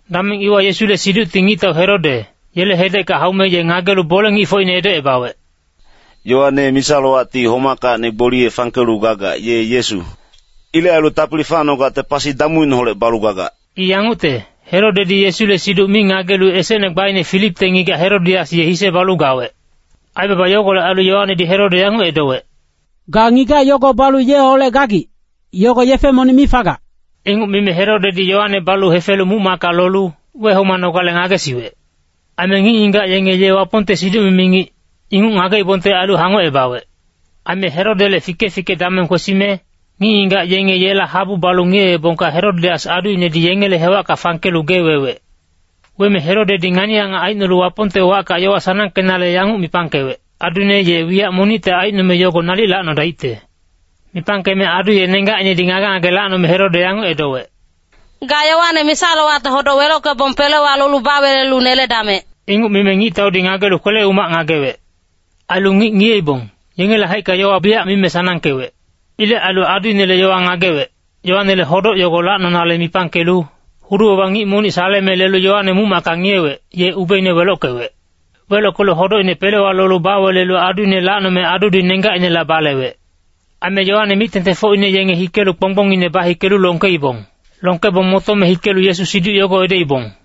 Dameng iwa Yesule siducti ngictau Herode, yele hedecka haume ye ngagelu bole-ngicfocine edocebawec, “Yoane misa-lowacti homackacni gboliye fangkelu gagac, ye Yesu. Ilec ailu tapili facnogacte pasi damuineholec balu gagac.” I yangucte, Herodedi Yesule siduc mi ngagelu esecne gbaine Filipte ngigac Herodias ye hise balu gawec. Aibaba yogolec ailu Yoanedi Herode yanguc edowec, “Ga ngigac yogo balu yeholec gagic, yogo yefe monic mi fagac.” Inguc mime Herodedi Yoane balu hefelu muc-macka lolu wehomanogale ngagesiwec. Aime ngic-ngigac yenge ye Wapongte siduc-mimi ngic, inguc ngageibongte ailu hangocebawec. Aime Herodele fike-fike dameng kwesime, ngic-ngigac yenge yela habu balu ngiyeebongka Herodias aduinedi yengele hewacka fangkelu gee wewec. Weme Herodedi ngani-angac aicnolu Wapongte wacka yowa sanangkenale yanguc mipangkewec, aduine ye wiyac monicte aicnome yogo nalic lacnodaicte. Mipangkeme adu ye nenggacinedi ngage-ngage lacnome Herode yanguc edowec, “Ga Yoane misa-lowacte hodoc welockebong pelewa lolu bawelelu neledamec.” Inguc mime ngictaudi ngagelu kwele-umac ngagewec. Ailu ngic ngiyeibong, yengele haicka yowa biyac mime sanangkewec. Ilec ailu aduinele yowa ngagewec, Yoanele hodoc yogo lacnonale mipangkelu hudu-baba ngic monic saleme lelu Yoane muc-macka ngiyewec, ye ubeine welockewec. Welockelu hodocine pelewa lolu bawelelu aduine lacnome adudi nenggacinela balewec. Aime Yoane mic-tengtengfocine yenge hikelu kponggbongine bahikelu longkeibong. Longkebong motome hikelu Yesu siduc yogo edoibong.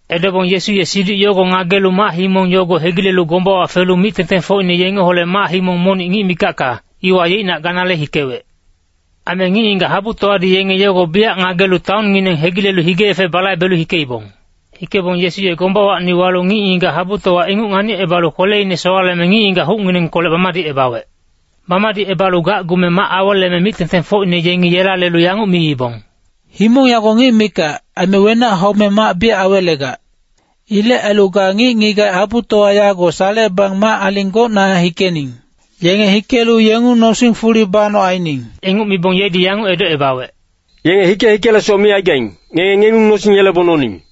Edobong Yesu ye siduc yogo ngagelu mac-himong yogo hegilelu gombawa felu mic-tengtengfocine yengeholec mac-himong monic ngic mikacka, iwa yeicnac ganale hikewec. Aime ngic-ngigac habutowadi yenge yogo biyac ngagelu taonngineng hegilelu hige-yefe balaibelu hikeibong. Hikebong Yesu ye gombawacni walu ngic-ngigac habutowa inguc nganicebalu kweleine sowaleme ngic-ngigac hucnginengkolec bamadicebawec. Bamadicebalu gacgume mac aweleme mic-tengtengfocine yengi yela lelu yanguc miibong, “Himong yago ngic mikac, aime wenac haume mac biyac awelegac. Ilec ailu ga ngic-ngigac habutowa yago salecebang mac-aling gocna hikening. Yenge hikelu yengung nosing fuli banoc aining.” Inguc mibong yedi yanguc edocebawec, “Yenge hike-hikelesoc mi aigaing, ngenge ngengung nosing yelebong noning.”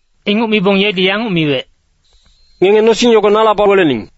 Inguc mibong yedi yanguc miwec, “Ngenge nosing yogo nala bawelening.”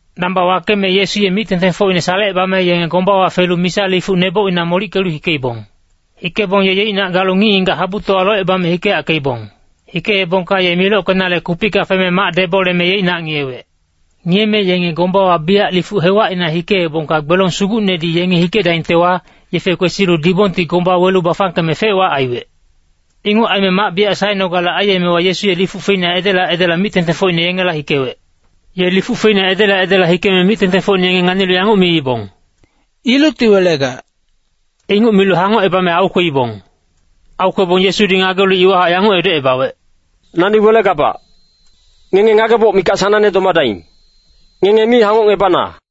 Damba wakeme Yesu ye mic-tengtengfocine salecebame yenge gombawa felu misa lifuc nebocina molickelu hikeibong. Hikebong ye yeicnac galu ngic-ngigac habutowa locebame hikeyackeibong. Hikeebongka ye milockenale kupicka feme mac deboleme yeicnac ngiyewec. Ngiyeme yenge gombawa biyac lifuc hewacina hikeebongka gbelong sugucnedi yenge hikedaingtewa, yefe kwesilu dibongti gomba welu bafangkeme fec-wac aiwec. Inguc aime mac biyac saenogale aiyemewa Yesu ye lifuc feina edela edela mic-tengtengfocine yengela hikewec. Ye lifuc feina edela edela hikeme mic-tengtengfocine yenge nganilu yanguc miibong, “Ilucti welegac.” Inguc milu hangocebame aukweibong. Aukwebong Yesudi ngagelu iwahac yanguc edocebawec, “Nani welegabac. Ngenge ngageboc mikac sanangne domadaing. Ngenge mi hangocngebana.”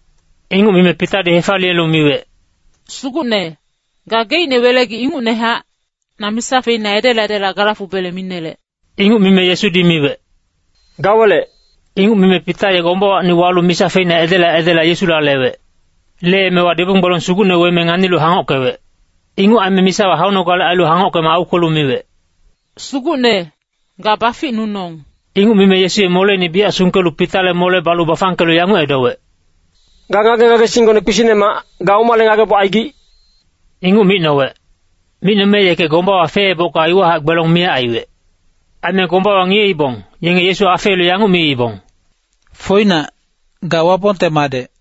Inguc mime Pitadi hefaliyelu miwec, “Sugucne, gageicne welegic ingucnehac, na misa feina edela edela gala fubele minelec.” Inguc mime Yesudi miwec, “Ga welec.” Inguc mime Pita ye gombawacni walu misa feina edela edela Yesula lewec. Leemewa dibong gbelong sugucne weme nganilu hangockewec. Inguc aime misawa haunogale ailu hangockeme aukwelu miwec, “Sugucne, ga baficnunong.” Inguc mime Yesu ye moleine biyac sungkelu Pitale mole balu bafangkelu yanguc edowec, “Ga ngage-ngagesinggone kpisicnemac, ga omale ngageboc aigic?” Inguc micnowec. Micnome yeke gombawa feebocka iwahac gbelong miyac aiwec. Aime gombawa ngiyeibong, yenge Yesu afeelu yanguc miibong, “Foinac, ga Wapongte Madec.”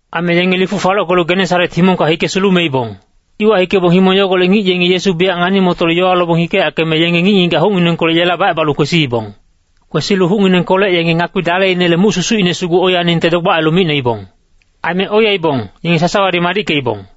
Aime yenge lifuc falockelu Genesaret himongka hike sulumeibong. Iwa hikebong himong yogolec ngic yengi Yesu biyac ngani-motolu yowa lobong hikeyackeme yenge ngic-ngigac hucnginengkolec yela bacebalu kwesiibong. Kwesilu hucnginengkolec yenge ngakpi daleinele muc susucine sugu oiyaningte dogbac ailu micnoibong. Aime oiyaibong, yenge sasawadi madickeibong.